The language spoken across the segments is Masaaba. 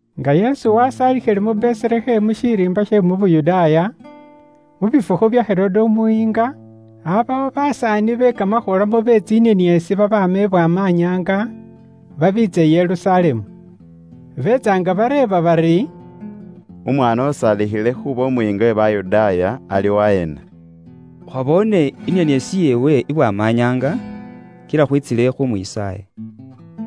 Nga Yesu wasaalikhile mu Beselehemu shiriimba she mu Yuda, mu bifukhu bya Herode umuyiinga, aabawo basaani be kamakhula mu bye tsinieniesi babaama i Bwamanyaanga, babiitsa i Yerusalemu. Beetsa nga bareeba bari, “Umwaana usaalikhile khuuba umuyiinga we Bayudaaya, ali waheena? Khwaboone inieniesi yeewe i Bwamanyaanga kila khwiitsile khuumwisaaya.”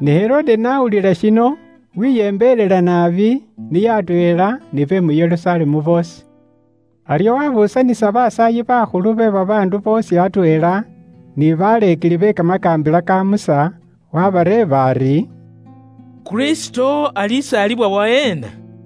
Ne umuyiinga Herode n'awulila shino, weyembelela naabi, niye atweela ni be mu Yerusalemu boosi. Aryo wabuusanisa basaayi bakhulu be babaandu boosi atweela, ni baleekeli be kamakaambila ka Musa, waabareeba ari, “Kristo alisaalibwa waheena?”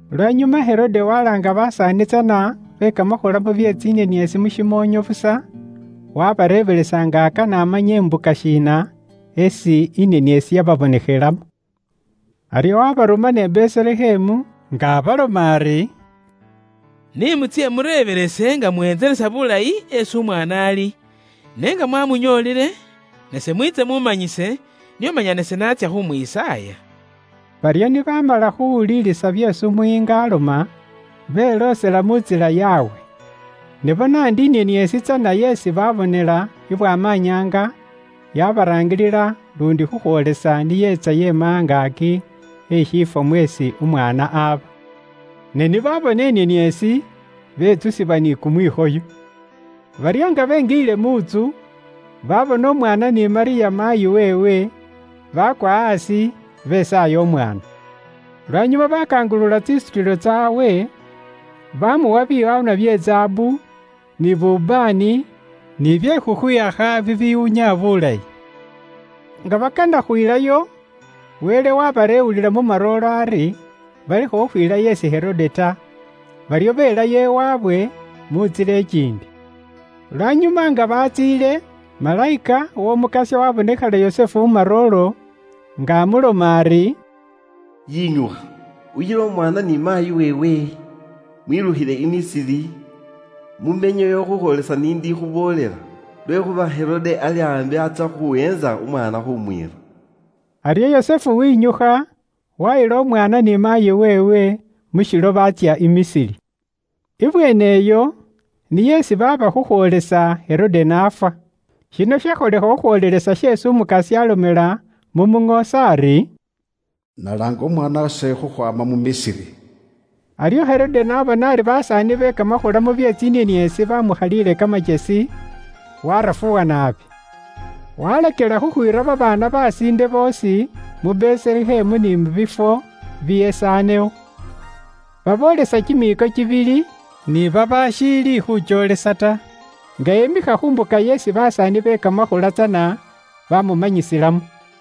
Lwanyuma Herode walaanga basaani tsana be kamakhula mu bye tsinieniesi mu shimoonyo busa, wabareebelesa nga akana amanye imbuka shiina esi inieniesi yababonekhelamo. Aryo waabarumana i Beselehemu, nga abaloma ari, “Ni mutsye mureebelese nga muwentelesa bulayi esi umwaana ali. Ne nga mwaamunyoolile, nase mwiitse muamanyise, nio manya nase naatsya khumwisaaya.” Baryo ni baamala khuuwulilisa byeesi umuyiinga aloma, beloosela mu ntsila yaabwe. Ne bona ndi inieniesi tsana yeesi baabonela i Bwamanyaanga, yaabaraangilila luundi khukhwoolesa ni yeetsa yeemikha angaaki e shiifwo mweesi umwaana aba. Ne ni baabona inieniesi, betsusibwa ni kumwikhoyo. Baryo nga benjiile mu ntsu, baabona umwaana ni Malyamu maayi weewe, baakwa aasi, besaaya umwaana. Lwanyuma baakangulula tsisutilo tsaabwe, baamuwa biwaanwa bye zaabu, ni bubaane, ni bye khukhwiyakha bibiwunya bulayi. Nga bakana khwiilayo, Wele waabareewulila mu marooro ari balekhe khukhwiilayo isi Herode ta, baryo beelayo iwaabwe mu ntsila ikiindi. Lwanyuma nga batsiile, malayika w'Omukasya waabonekhela Yusufu mu marooro, nga amuloma ari, “Yinyukha, uyile umwaana ni maayi weewe, mwilukhile i Misiri, mumenyeyo khukhwoolesa ise n'indikhuboolela. Lwekhuuba Herode ali aambi atsya khuweentsa umwaana khuumwiira.” Aryo Yusufu wenyukha, waayila umwaana ni maayi weewe mu shilo baatsya i Misiri. Ibweene iyo niyo isi aaba khukhwoolesa Herode n'afwa. Shino shakholekha khukhwoolelesa sheesi Umukasya aalomela mu muŋoosi ari, “Nalaanga umwaana wase khukhwaama mu Misiri.” Aryo Herode n'abona ari basaani be kamakhula mu bye tsinieniesi baamukhaliile kamakyesi, waarafuwa naabi. Waalakila khukhwiira babaana besiinde boosi mu Beselehemu, ni biifwo bibyesaanewo, baboolesa kimiiko kibili ni khukhwiila aasi, nga emikha khu mbuka yeesi basaani be kamakhula tsana baamuboolelamo.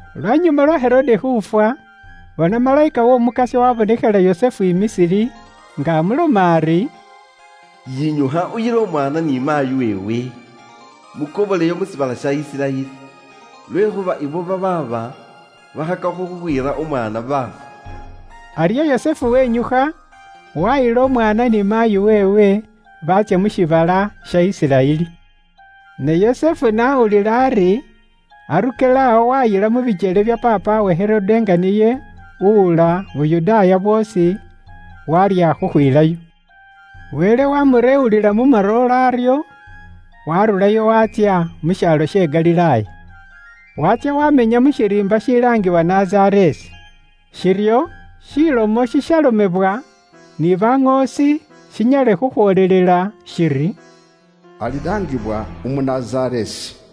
Lwanyuma lwa Herode khuufwa, bona, malayika w'Omukasya waabonekhela Yusufu i Misiri, nga amuloma ari, “Yinyukha uyile umwaana ni maayi weewe, mukoboleyo mu shiibala sha Isiraeli, lwekhuuba abo babaaba bakhakakho khuuweentsa buulamu bw'omwaana baafwa khaale.” Aryo Yusufu wenyukha, waayila umwaana ni maayi weewe, baatsya mu shiibala sha Isiraeli. Ne Yusufu n'awulila ari Arukelawo waayila mu bikyele bya paapawe Herode nga niye uwula Yuda bwoosi, waarya khukhwiilayo. Wele waamureewulila mu marooro, aryo waarurayo waatsya mu shaalo she Galilaaya. Waatsya waamenya mu shiriimba shilaangibwa Nazareesi. Shiryo, shilomo shishalomebwa ni baŋoosi shinyale khukhwoolelela shiri, “Alilaangibwa umu Nazareesi.”